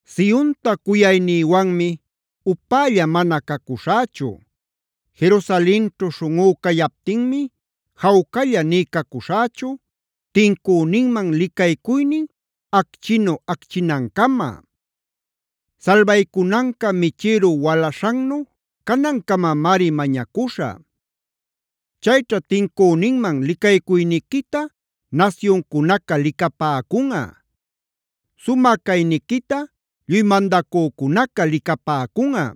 Sionta cuyaynïwanmi upälla mana cacuśhächu; Jerusalenćhu śhunꞌú cayaptinmi jawcalla nï cacuśhächu tincüninman licaycuynin acchinu acchinancama; salbaycunanca michïru walaśhannu canancamamari mañacuśhä. Chayćha tincüninman licaycuyniquita nasyuncunaca licapäcunꞌa; sumä cayniquita lluy mandacücunaca licapäcunꞌa.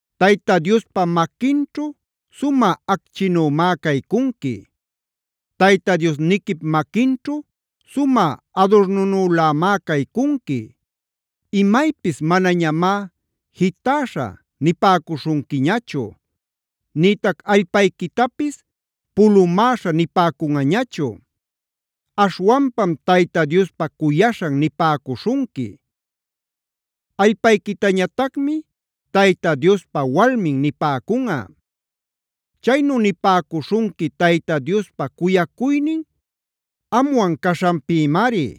Tayta Diospa maquinćhu sumä acchinümá caycunqui; Tayta Diosniquip maquinćhu sumä adurnunülamá caycunqui. Imaypis manañamá “Jitäśha” nipäcuśhunquiñachu. Nïtac allpayquitapis “Pulumäśha” nipäcunꞌañachu. Aśhwanpam “Tayta Diospa cuyaśhan” nipäcuśhunqui. Allpayquitañatacmi “Tayta Diospa walmin” nipäcunꞌa. Chaynu nipäcuśhunqui Tayta Diospa cuyacuynin amwan caśhanpïmari;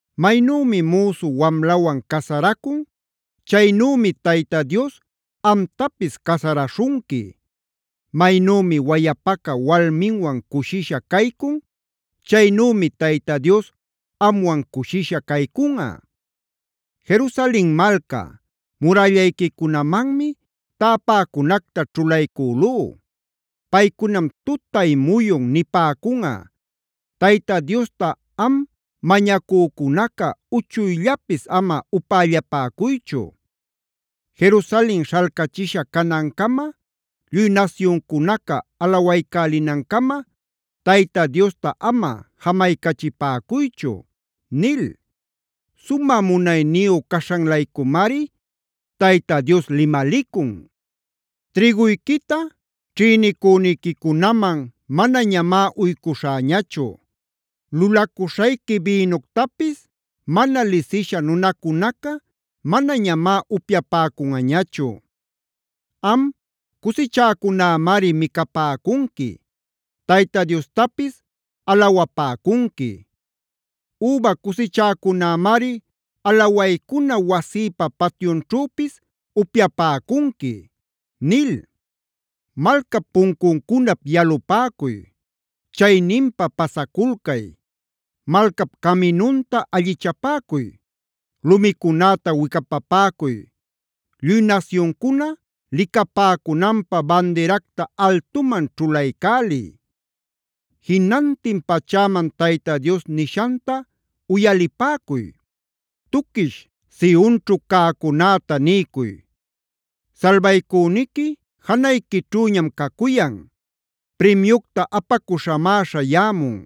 Maynümi müsu wamlawan casaracun, chaynümi Tayta Dios amtapis casaraśhunqui. Maynümi wayapaca walminwan cushisha caycun, chaynümi Tayta Dios amwan cushisha caycunꞌa. Jerusalen malca, murällayquicunamanmi täpäcunacta ćhulaycülú.c Paycunam tutay muyun nipäcunꞌa: “Tayta Diosta am mañacücunaca, uchuyllapis ama upällapäcuychu. Jerusalen śhalcachisha canancama, lluy nasyuncunaca alawaycälinancama, Tayta Diosta ama jamaycachipäcuychu” nil. Sumä munayniyu caśhan-laycumari Tayta Dios limalicun: “Trïguyquita ćhïnicüniquicunaman manañamá uycuśhäñachu; lulacuśhayqui bïnuctapis mana lisisha nunacunaca manañamá upyapäcunꞌañachu. Am, cusichäcunämari micapäcunqui; Tayta Diostapis alawapäcunqui. Üba cusichäcunämari alawaycuna wasïpa patyunćhüpis upyapäcunqui” nil. ¡Malcap puncuncunap yalupäcuy! ¡Chayninpa pasaculcay! Malcap caminunta allichapäcuy. Lumicunäta wicapapäcuy. Lluy nasyuncuna licapäcunanpä bandiracta altuman ćhulaycäliy. Jinantin pachäman Tayta Dios nishanta uyalipäcuy. Tuquish Sionćhud cäcunäta niycuy: “Salbaycüniqui janayquićhüñam cacuyan. Primyucta apacuśhamá śhayämun;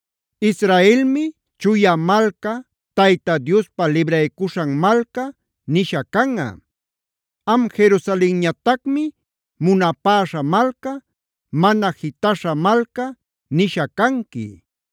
Israelmi “Chuya malca” “Tayta Diospa libraycuśhan malca” nisha canꞌa. Am Jerusalenñatacmi “Munapäśha malca”, “Mana jitaśha malca” nisha canqui.